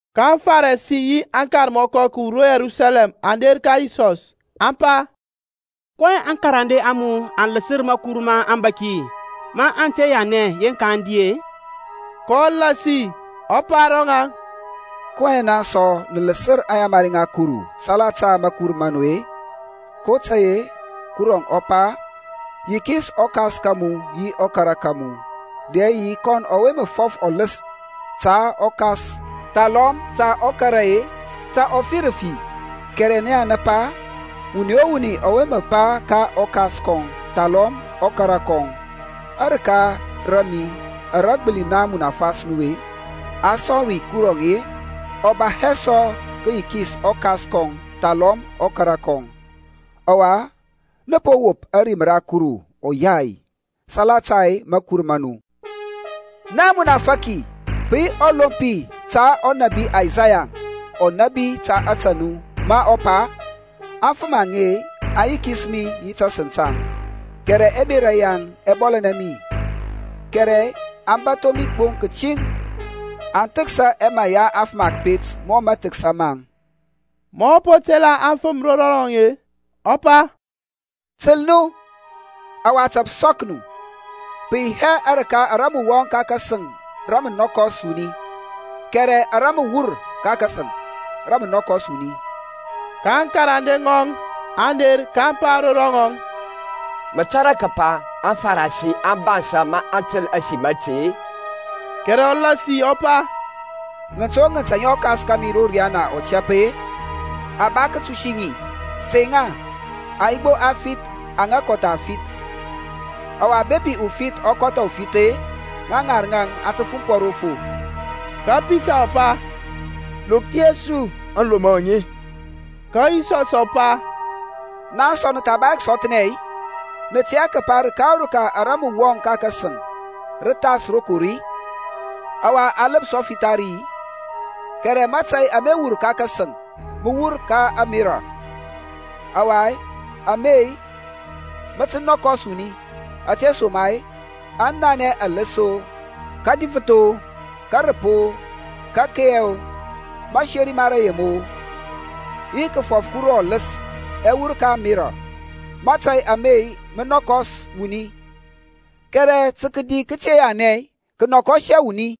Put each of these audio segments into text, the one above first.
Ka aŋFarisi yi aŋkarmɔkɔ kǝwur ro Yerusalem aŋ der ka Yisɔs, aŋ pa, kɔyɛŋ aŋkarande a mu aŋ lǝsǝr makur ma aŋbȧki ma aŋ te yanɛ yeŋka aŋ di-e? kɔ lasi ɔ pa ro ŋaŋ, kɔyɛŋ naŋ sɔ nǝ lǝsǝr aŋyamari ŋa Kuru salata makur ma nu-e? kotȧy-e Kuruȧŋ ɔ pa, Yikis ɔkas ka mu yi ɔkara ka mu, dɛ yi; Kɔn ɔwe mǝ fɔf ɔlǝs ta ɔkas thalɔm ta ɔkara-e, ta ɔ fi rafi. Kɛrɛ naŋ nǝ pa, Wuni o wuni ɔwe mǝ pa ka ɔkas kɔŋ thalɔm ɔkara kɔŋ, Arǝka ra mi ara gbǝli naŋ munafas mu-e, a sɔŋ ri Kuru-e, ɔ ba hɛ sɔ tǝ kǝyikis ɔkas kɔŋ thalɔm ɔkara kɔŋ. Ɔwa nǝ po wop ȧrim ra Kuru ɔyai salata makur ma nu. Na amunafaki, pǝ yi ɔlompi ȧte ɔnȧbi Isaya ɔ nȧbi ta ȧtȧ nu ma ɔ pa, Aŋfǝm aŋe aŋ yikis mi yi tasǝŋ taŋ, Kɛrɛ ɛmerȧ yaŋ ɛ bɔlȧnɛ mi. Kɛrɛ aŋ bȧtho mi gbo kǝtiŋ, aŋ thǝksa ɛmaŋ ya afǝm a kǝpet mɔ mȧthǝksȧ maŋ. Mȧ ɔ po tela aŋfǝm ro rɔŋɔŋ-e, ɔ pa, Tǝl nu, ɔwa tȧ pǝ sɔk nu. Pǝ yi hɛ arǝka ara mǝ wɔŋ ka kasǝŋ ara mǝ nɔkɔs wuni, kɛrɛ ara mǝ wur ka kasǝŋ, rǝ mǝ nɔkɔs wuni. Ka aŋkarande ŋɔŋ aŋ der kaŋ pa ro rɔŋɔŋ, Mǝ tȧrȧ kǝpa aŋFarisi aŋ bansȧ maŋ tǝl ȧsim ȧte-i? Kɛrɛ ɔ lasi ɔ pa, Ŋǝnt o ŋǝnt aŋa ɔKas kȧmi ro riyana ɔ te tɛp-e, a ba kǝtusi ŋi. Tey ŋa, aŋ yi gbo afith aŋa kɔtha aŋfith. Ɔwa bepi ufith ɔ kɔtha ufith-e, ŋa ŋarǝŋ aŋ tǝ fumpɔ ro fo. Ka Pita ɔ pa, Lokthia su aŋlomɔ aŋe. Ka Yisɔs ɔ pa, Naŋ sɔ nǝ tha ba hɛ kǝsɔthnɛ-i? Nǝ tɛ hɛ kǝpa rǝka o rǝka ara mǝ wɔŋ ro sǝŋ rǝ thas rokor-i, ɔwa a lǝpsɔ fitha ri-i? Kɛrɛ mȧtȧy ama wur ka kasǝŋ mǝ wur ka ȧŋmerȧ; ɔwa ame-e, mǝ mǝ nɔkɔs wuni. Ȧtesoma-e ɛnanɛ ɛlǝs-o, kǝdifǝth-o, kǝrǝp-o, rǝkeiyo, mǝseri ma rǝyem-o yi kǝfɔf Kuru ɔlǝs-e, ɛ wur ka ȧŋmerȧ. Mȧtȧy ame mǝ mǝ nɔkɔs wuni, kɛrɛ tǝ kǝdi kǝte yanɛ kǝ nɔkɔs hɛ wuni.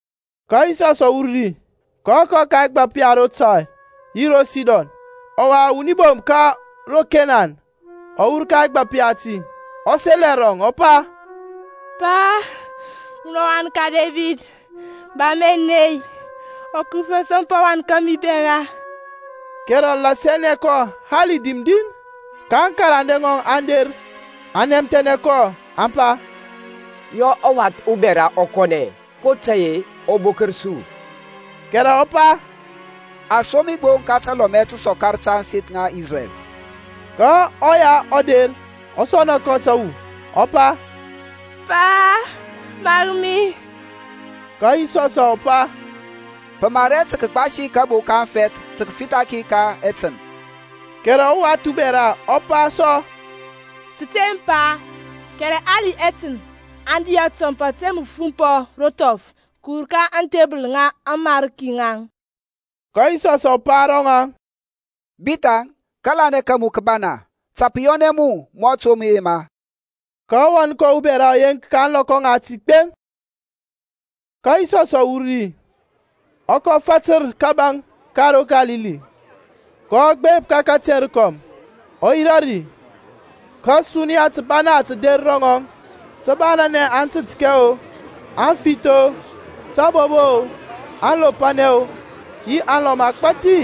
Ka Yisɔs ɔ wur ri, ɔ kɔ ka ɛgbap ya ro Tair yi ro Sidon. Ɔwa wuni bom ka ro Kenan ɔ wur ka ɛgbap yati, ɔ sel ɛrɔŋ ɔ pa, Pa, munɔ ɔwan ka Debid, ba mi ȧney. Ukǝrǝfi ɔ sɔmpa ɔwan kȧmi ubɛra. Kɛrɛ ɔ lasianɛ hɛ kɔ hali dim din. Ka aŋkarande ŋɔŋ aŋ der aŋ nɛmthɛnɛ kɔ, aŋ pa, Yɔ ɔwath ubɛra ɔ kɔnɛ, kotȧy-e ɔ bokǝr su. Kɛrɛ ɔ pa, A som mi gbo ka talɔmɛ tǝsɔkar ta ȧŋseth ŋa Isrɛl. Ka ɔya ɔ der ɔ sɔna kɔ tǝwu, ɔ pa, Pa, mar mi. Ka Yisɔs ɔ pa, Pǝ mar hɛ tǝ kǝgbasi kabo ka aŋfɛth tǝ kǝfitha ki ka ɛtǝn. Kɛrɛ ɔwath ubɛra ɔ pa sɔ, Tǝteŋ Pa, kɛrɛ hali ɛtǝn aŋ di atɔmp ȧte mǝ fumpɔ ro thɔf kǝwur ka aŋthebǝl ŋa aŋmarki ŋaŋ. Ka Yisɔsȧŋ ɔ pa ro ŋɔŋ, Bithaŋ, kȧlanɛ ka mu kǝ bana. Ta pǝ yɔnɛ mu mɔ mǝ mǝ yema. Ka ɔwan kɔŋ ubɛra ɔ yeŋk ka ȧŋlɔkɔ ŋati gbeŋ. Ka Yisɔs ɔ wur ri, ɔ kɔ fatǝr kȧbȧŋ ka ro Kalili. Kɔ gbep ka kateŋ rokɔm, ɔ yirȧ ri. Ka suniya tǝbana tǝ der ro ŋɔŋ tǝ banȧnɛ aŋtǝtkɛ-o, aŋfith-o, tabobo-o, aŋlopanɛ-o yi alɔm agbȧthi,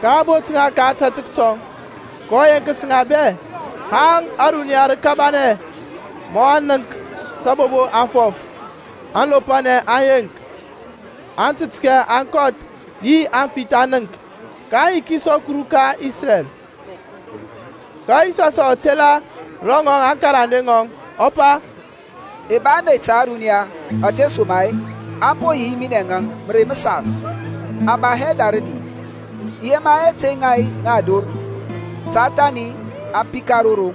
ka a bot ŋa ka ȧtȧtək tɔŋ. Kɔ yeŋkǝs ŋa bɛ, haŋ ȧruniya rǝ kabanɛ maŋ nənk tabobo aŋ fɔf, aŋlopanɛ aŋ yeŋk, aŋtǝtkɛ aŋ kɔth yi aŋfith aŋ nənk. Kaŋ yikis ɔKuru ka Isrɛl. Ka Yisɔs ɔ tela ro ŋɔŋ aŋkarande ŋɔŋ, ɔ pa, I ba ȧney ta ȧruniya, ȧtesoma-e aŋ po yi yi minɛŋ mǝrei mǝsas, aŋ ba hɛ ra rǝdi. I yema hɛ tey ŋa ŋa ador, ta thani aŋ pika ro roŋ.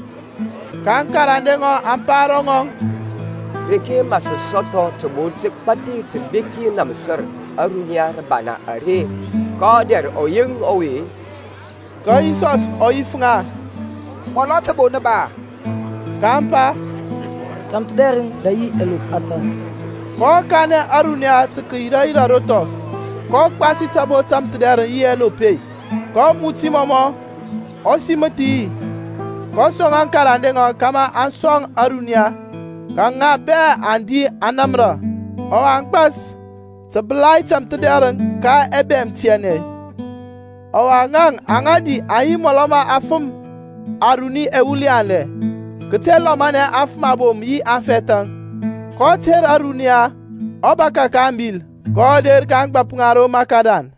Ka aŋkarande ŋɔŋ aŋ pa ro ŋɔŋ, Reke mǝ sǝ sɔthɔ tǝbo tǝgbathi tǝbeki namsǝr ȧruniya rǝbana are ka ɔdɛr ɔyeŋ ɔwe-e? Ka Yisɔs ɔ yif ŋa, Mɔlɔ tǝbo nǝ ba-a? kaŋ pa, Tamthǝdɛrǝŋ, dɛ yi ɛlop athȧn. kɔ kanɛ ȧruniya tǝ kǝyira yirȧ ro thɔf. kɔ gbasi tǝbo tamthǝdɛrǝŋ yi ɛlop-e, kɔ muti mɔmɔ, ɔ simǝth yi, kɔ sɔŋ aŋkarande ŋɔŋ kȧmȧ aŋ sɔŋ ȧruniya. Ka ŋa bɛ aŋ di aŋ namra, ɔwa aŋ gbas tǝbǝlai tamthǝdɛrǝŋ ka ɛbɛm ɛtianɛ. Ɔwa ŋaŋ aŋa di aŋ yi mɔlɔ ma afǝm aruni ɛwul yanlɛ, kǝte lɔmanɛ aŋfǝm abom yi aŋfɛthȧŋ. kɔ ter ȧruniya, ɔ bȧkȧ ka ȧŋbil, kɔ der ka ȧŋgbȧp ŋa ro Makadan.